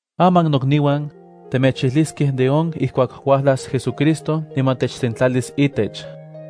Aman nokniuan, temechijliskej de on ijkuak uajlas JesuCristo niman techsentlalis itech.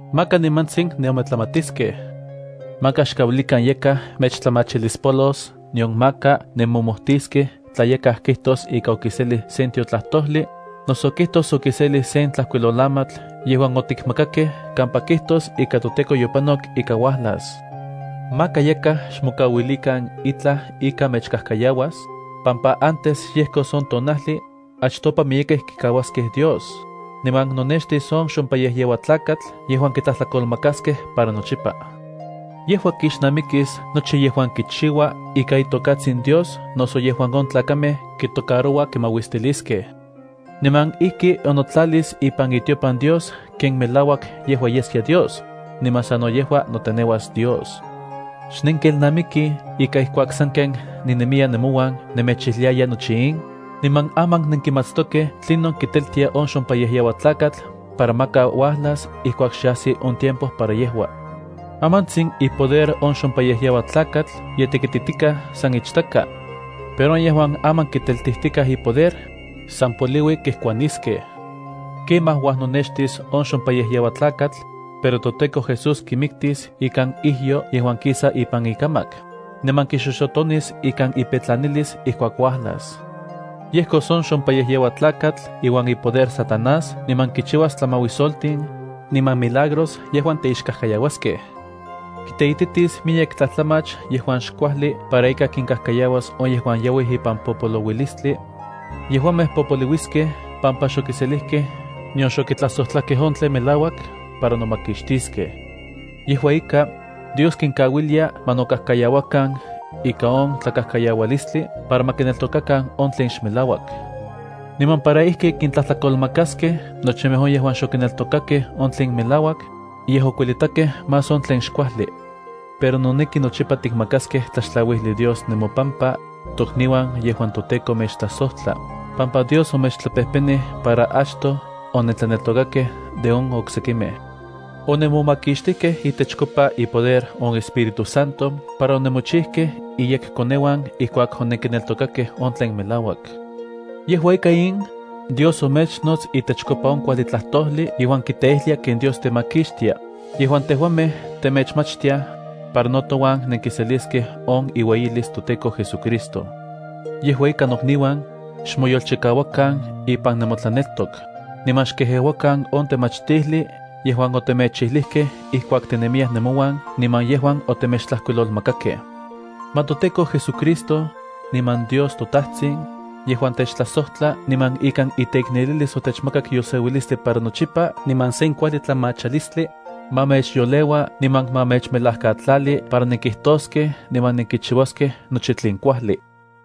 maka nimantsin nenometlamatiskej. Maka xkauilikan yakaj mechtlamachilispolos nion maka nemomojtiskej tla yakaj kijtos ika okiselij sen tiotlajtojli, noso kijtos okiselij sen tlajkuilolamatl yejuan otikmakakej kampa kijtos ika toTEKO yopanok ika uajlas. Maka yakaj xmokauilikan itlaj ika mechkajkayauas, pampa antes yejkos on tonajli, achtopa miyekej kikauaskej Dios, niman nonextis on xompayejyeuatlakatl yejuan kitlajtlakolmakaskej niman kontlajkaliskej miktlan. Yejua kixnamikis nochi yejuan kipiya itokatsin Dios noso on tlen on tlakamej kimauistiliaj. Niman ijki onotlalis ipan itiopan Dios ken melauak yejua yeskia Dios, niman sano yejua noteneuas Dios. ¿Xnenkelnamikij ika ijkuak sanken ninemiya nemouan nemechijliaya nochi in? Niman aman nenkimatstokej tlinon kiteltia on xompayejyeuatlakatl para maka uajlas ijkuak xe ajsi on tiempo para yejua. Amantsin ipoder on xompayejyeuatlakatl ye tekititikaj san ichtaka. Pero on yejuan aman kiteltijtikaj ipoder, san poliui kejkuaniskej. Kemaj uajnonextis on xompayejyeuatlakatl, pero toTEKO Jesús kimiktis ikan ijyo yejuan kisa ipan ikamak, niman kixoxotonis ikan ipetlanalis ijkuak uajlas. Yejkos on xompayejyeuatlakatl iuan ipoder Satanás niman kichiuas tlamauisoltin, niman milagros yejuan teixkajkayauaskej. Kiteititis miyek tlajtlamach yejuan xkuajli para ika kinkajkayauas on yejuan yauij ipan popolouilistli. Yejuamej popoliuiskej pampa xokiselijkej nion xokitlajsojtlakej on tlen melauak para nomakixtiskej. Yejua ika, Dios kinkauilia ma nokajkayauakan ika on tlakajkayaualistli para ma kineltokakan on tlen xmelauak, niman para ijki kintlajtlakolmakaskej nochimej on yejuan xokineltokakej on tlen melauak, yej okuelitakej más on tlen xkuajli. Pero noneki nochipa tikmakaskej tlaxtlauijli Dios nemopampa, tokniuan yejuan toTEKO mechtlajsojtla, pampa Dios omechtlapejpenij para achtoj onentlaneltokakej de on oksekimej. Onemomakixtijkej itechkopa ipoder on Espíritu Santo para onemochijkej iyekkoneuan ijkuak onenkineltokakej on tlen melauak. Yejua ika in, Dios omechnots itechkopa on kuajli tlajtojli yejuan kiteijlia ken Dios temakixtia, yejuan tejuamej temechmachtiaj, para no touan nenkiseliskej on iueyilis toTEKO JesuCristo. Yejua ika nokniuan, xmoyolchikauakan ipan nemotlaneltok, niman xkejeuakan on temachtijli yejuan otemechijlijkej ijkuak tinemiyaj nemouan niman yejuan otemechtlajkuilolmakakej. Ma toTEKO JesuCristo, niman Dios toTajtsin, yejuan techtlajsojtla niman ikan iteiknelilis otechmakak yolseuilistli para nochipa niman sen kuajli tlamachalistli, ma mechyoleua niman ma mechmelajkatlali para nenkijtoskej niman nenkichiuaskej nochi tlen kuajli.